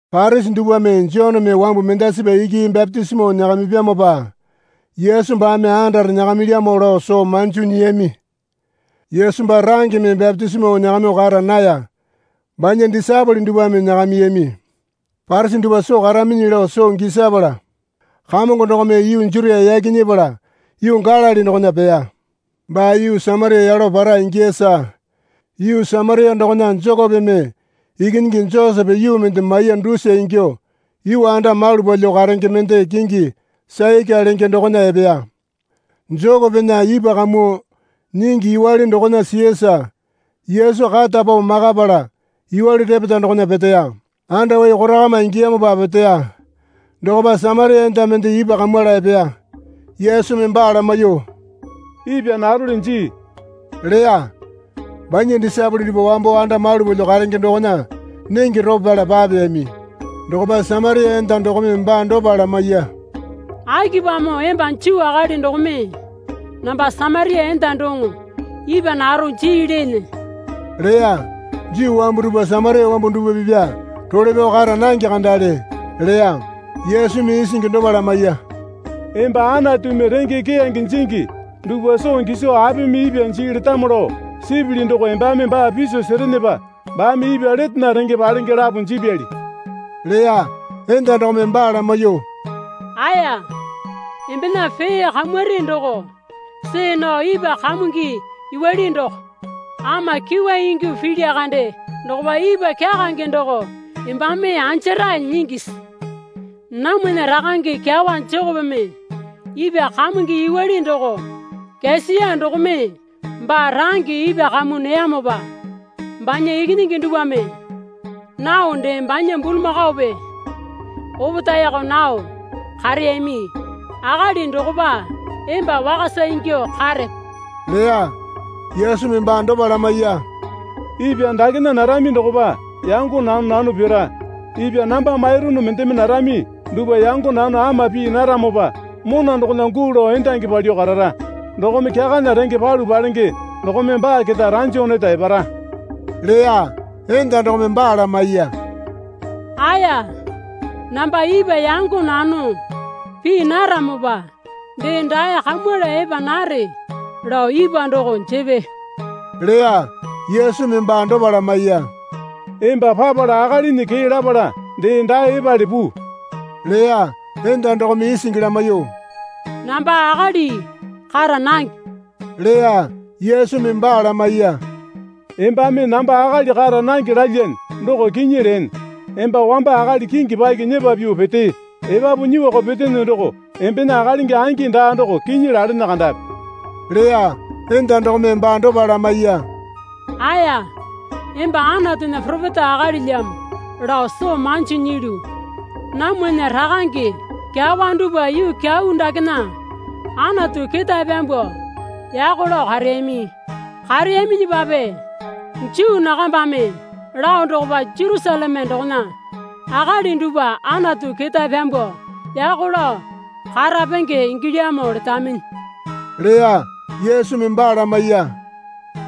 Parisi dupwame Joneme wambu mendasipa iki bapitisimo nyakamipyamopa Yesu baame andare nyakamilyamo lao soo manjo nyiyami. (Yesu baa rangeme bapitisimo nyakamyuo kara naya. Banya disaepole dupwame nyakamiyami.) Parisi dupwa soo karaminyi lao soo gisapala Kamongo dokome yuu Jutia yaki nyepala yuu Galili dokona peya. Baa yuu Samaria yalo para ingiyasa. Yuu Samaria dokona Jekopeme ikinyingi Josepe yuu mende maiya dusa ingyuo yuu anda malu palyuo karenge mende kingi Saika lenge dokona epeya. Jekopena ipwa kamuo nyingi yuwale dokona siyasa Yesu kata pao makapala yuwale repeta dokona peteya. Andawai korakama ingiyamopa peteya. Dokopa Samaria enda mende ipwa kamwala epeya. Yesumi baa lamaiyuo, Ipwa narole jii leya. (Banya disaepole dupwa wambo anda malu palyuo karenge dokona nenge ropo pyala papeyami.) Dokopa Samaria enda dokome baa dopa lamaiya. Akipamo emba Juu akali dokome namba Samaria enda doŋo ipwa naro jii leene? leya. Juu wambu dupwa Samaria wambu dupwa pipya role pyao kara nange kandale leya. Yesumi isingi dopa lamaiya. Emba Anatumi renge keyange jingi dupwa soo giso apimi ipwa jii letamo lao sipili doko embame baa piso serenepa baame ipwa letena renge palenge lapo jipyali, leya. Enda dokome baa lamaiyuo, Aeya, embena pee kamuri doko see nao ipwa kamungi yuwale doko ama kyuwa ingyuo pilya kande dokopa ipwa kyakange doko embame anjarae nyingisi? Namwana rakange kyawa Jekopeme ipwa kamungi yuwale doko kyasiya dokome baa range ipwa kamuo neyamopa banya ikinyingi dupwame nao dee banya bulamakaope opetaeko nao kareyami akali dokopa emba wakasa ingyuo karepe? leya. Yesumi baa dopa lamaiya. Ipwa dakena narami dokopa yango nano nano pira. Ipwa namba mairunu mendeme narami dupwa yango nano ama pii naramopa mona dokona guu lao endangi palyuo karara. Dokome kyakana renge palu palenge dokome baa keta ranjo neta epara leya. Enda dokome baa lamaiya. Aeya, namba ipwa yango nano pii naramopa dee dae kamwala epa nare lao ipwa doko jepe leya. Yesumi baa dopa lamaiya. Emba papala akalinyi kee lapala dee dae epale puu leya. Enda dokome isingi lamaiyuo, Namba akali kara nange leya. Yesumi baa lamaiya. Embame namba akali kara nange lalyane doko kinyi leene. Emba wamba akali kingi paki nyepa pyuo petee, epapu nyuoko petene doko embena akalingi angi daa doko kinyi lalene kandapi, leya. Enda dokome baa dopa lamaiya. Aeya, emba Anatunya poropeta akalilyamo lao soo manji nyilyu. Namwana rakange kyawa dupwa yuu kyau dakena Anatu ketae pyambuo yako lao kareyami. Kareyaminyipape Juu nakambame lao dokopa Jerusaleme dokona akali dupwa Anatu ketae pyambuo yako lao karapenge ingilyamo letaminyi, leya. Yesumi baa lamaiya.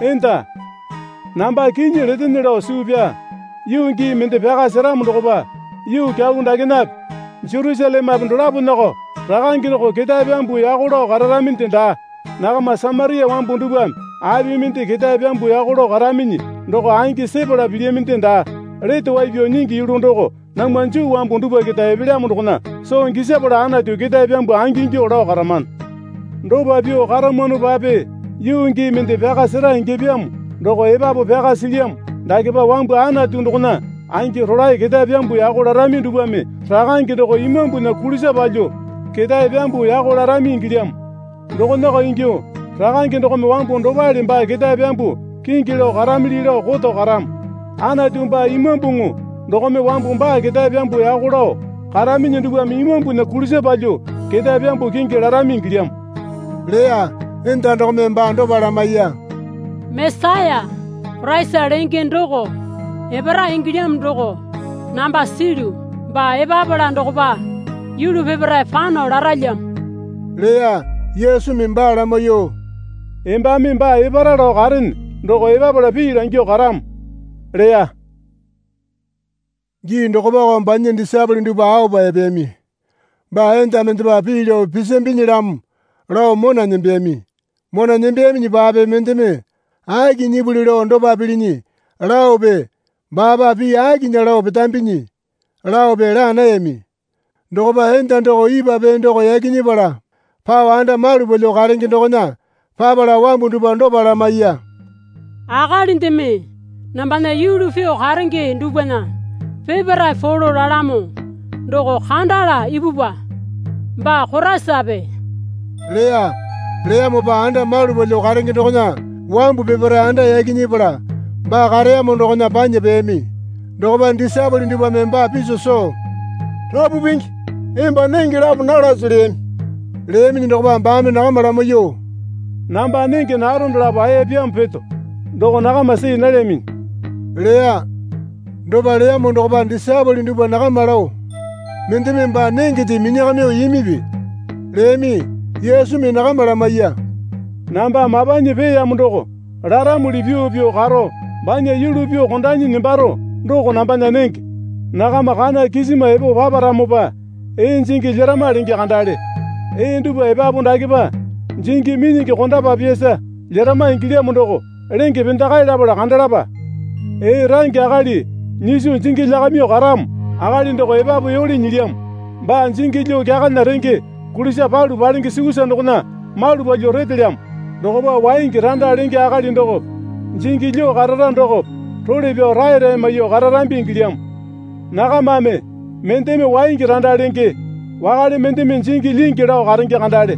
Enda, namba kinyi letene lao suu pyaa, yuu gii mende pyaka seramo dokopa yuu kyau dakenape Jerusalemepe dolaponako Rakange doko ketae pyambuo yako lao kararaminde daa. Nakama Samaria wambu dupwame api mende ketae pyambuo yako lao karaminyi doko angi sepala pilyaminde daa. Lete wai pyao nyingi yulu doko namwa Juu wambu dupwa keta epelyamo dokona soo gisapala Anatu ketae pyambuo angingyuo lao karamano. Dopa pyuo karamwanopape yuu gii mende pyaka sera ingyapyamo doko epapu pyaka silyamo dakepa wambu Anatu dokona angi rolae ketae pyambuo yako larami dupwame Rakange doko imambunya kulisa palyuo ketae pyambuo yako larami ingilyamo. Dokonako ingyuo Rakange dokome wambu dopale baa ketae pyambuo kingi lao karamili lao koto karamo. Anatu baa imambuŋu dokome wambu baa ketae pyambuo yako lao karaminyi dupwame imambunya kulisa palyuo ketae pyambuo kingi larami ingilyamo leya. Enda dokome baa dopa lamaiya. Mesaya (Koraisa lenge doko) epara ingilyamo doko namba silyu. Baa epapala dokopa yulu peparae pano laralyamo leya. Yesumi baa lamaiyuo, Embame baa epara lao karene doko epapala pii langyuo karamo leya. Gii dokopako banya disaepole dupwa aopa epeyami. Baa enda mendepa pii lao pisambinyilamo lao mona nembeyami. Mona nembeyaminyipape mendeme, Aki nyipuli lao dopa pilinyi? laope, Baapa pii akinya lao petambinyi? laope laa nayami. Dokopa enda doko ipwa pee doko yaki nyepala pao anda malu palyuo karenge dokona papala wambu dupwa dopa lamaiya. Akalindeme nambana yulu pyuo karenge dupwana peparae polo lalamo doko kandala ipupwa. Baa Koraisape? leya. Leyamopa anda malu palyuo karenge dokona wambu peparae anda yaki nyepala baa kareyamo dokona panya peyami. Dokopa disaepole dupwame baa piso soo, Rapu Pingi, emba nenge lapo nalase leyami. Leyaminyi dokopa baame nakama lamaiyuo, Namba nenge naro dalapo aeyapyamo peto doko nakama see nalyaminyi leya. Dopa leyamo dokopa disaepole dupwa nakama lao, Mendeme baa nengende minyakamyuo imipi? leyami. Yesumi nakama lamaiya. Namba mapanyi peeyamo doko laramuli pyuo pyuo karo banya yulu pyuo kondanyi nembaro doko nambana nenge. Nakama, Kana kisima epo paparamopa ee jingi lyerama lenge kandale. Ee dupwa epapu dakepa jingi minyingi kondapapyasa lyerama ingilyamo doko lenge pendakae lapala kandalapa. Ee range akali nyiso jingi lyakamyuo karamo akali doko epapu yole nyilyamo. Baa jingi lyuo kyakana renge kulisa palu palenge sukusa dokona malu palyuo retelyamo. Dokopa waingi randa lenge akali dokope jingi lyuo karara dokope role pyao raerae maiyuo kararambi ingilyamo. Nakamame, Mendeme waingi randa lenge, wakale mendeme jingi lyingi lao karenge kandale.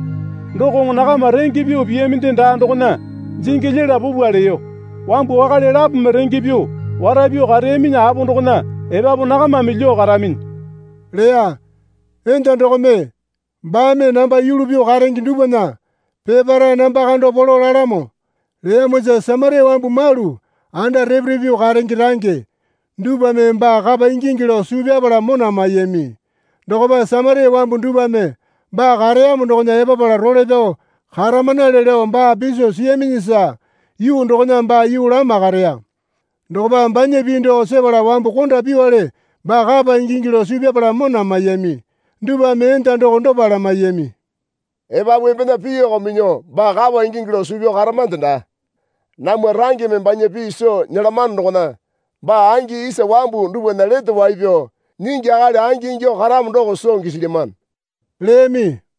Dokoŋo nakama renge pyuo piyaminde daa dokona jingi lyela pupwa leyo. Wambu wakale lapome renge pyuo wara pyuo kareyaminyi apo dokona epapu nakamame lyuo karaminyi leya. Enda dokome, Baame namba yulu pyuo karenge dupwana peparae namba kando polo lalamo, leyamosa Samaria wambu malu anda repe repe pyuo karenge range dupwame baa kapa ingingi lao suu pyapala mona maiyami. Dokopa Samaria wambu dupwame baa kareyamo dokona epapala role pyao karamanale lao baa piso siyaminyisa yuu dokona baa yuu lama kareya. Dokopa banya pii doko sepala wambu konda pyuowale baa kapa ingingi lao suu pyapala mona maiyami. Dupwame enda doko dopa lamaiyami. Epapu embena piiko minyuo baa kapa ingingi lao suu pyao karamande daa. Namwa rangeme banya pii soo nyelamano dokona baa angi isa wambu dupwana Lete Wai Pyao Nyingi akali angi ingyuo karamo doko soo gisilyamano, leyami.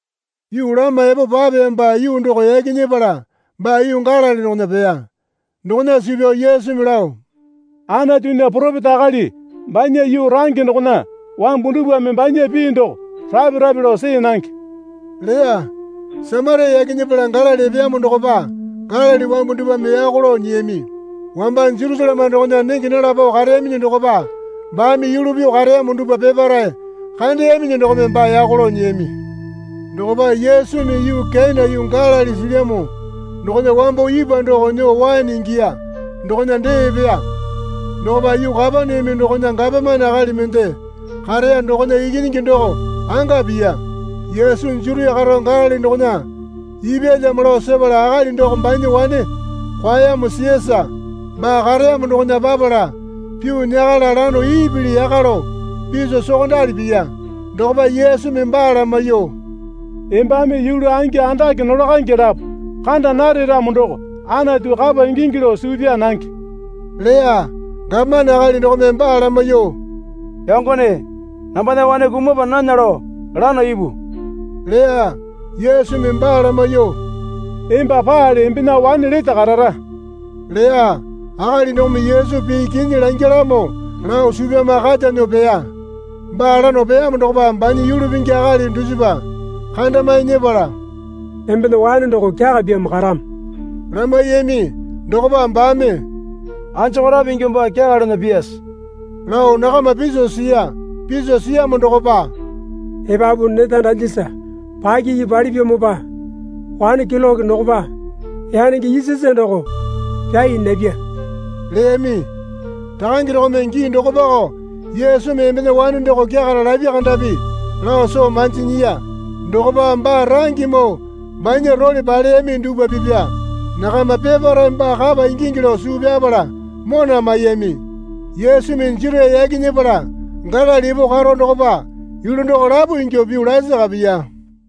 Yuu lama epo papeyamopa yuu doko yaki nyepala baa yuu Galili dokona peya. Dokona suu pyao Yesumi lao, Anatunya poropeta akali banya yuu range dokona wambu dupwame banya pii doko rape rape lao see nange leya. Samaria yaki nyepala Galili epeyamo dokopa Galili wambu dupwame yako lao nyiyami. Wamba Jerusaleme dokona nenge nala pao kareyaminyi dokopa baame yulu pyuo kareyamo dupwa peparae kandeyaminyi dokome baa yako lao nyiyami. Dokopa Yesumi yuu Kena yuu Galili silyamo dokona wambo ipwa doko nyuo waene ingiya dokona dee epeya. Dokopa yuu Kapaneame dokona gapomane akali mende kareya dokona ikinyingi doko anga piya. Yesu Jutia karo Galili dokona ipyalyamo lao sepala akali doko banya wane kwaeyamo siyasa baa kareyamo dokona papala pyuo nyakala lano ipili yaka lao piso sokondali piya. Dokopa Yesumi baa lamaiyuo, Embame yulu angi andake nolakaenge lapo kanda nare ramo doko Anatu kapa ingingi lao suu pyaa nange leya. Gapomane akali dokome baa lamaiyuo, Yangone, nambana wane kumapa nana lao lano ipu leya. Yesumi baa lamaiyuo, Emba paale embena wane lete karara leya. Akali dokome Yesu pii kinyi langyalamo lao suu pyama kata nyuo peya. Baa lano peyamo dokopa banya yulu pingi akali dusipa kandamae nyepala, Embena wane doko kyakapyamo karamo, lamaiyami. Dokopa baame, Anjokorape ingyuo baa kyakalana pyase? lao nakama piso siya. Piso siyamo dokopa, Epapu neta dalyasa pakiki palipyamopa wane keloke dokopa yanenge isasa doko pyai napya leyami. Rakange dokome gii dokopako Yesumi embena wane doko kyakara lapya kandapi lao soo manji nyiya. Dokopa baa rangemoo banya role paleyami dupwa pipya nakama peparae baa kapa ingingi lao suu pyapala mona maiyami. Yesumi Jutia yaki nyepala Galili epo karo dokopa yulu doko lapo ingyuo pyuo lasaka piya.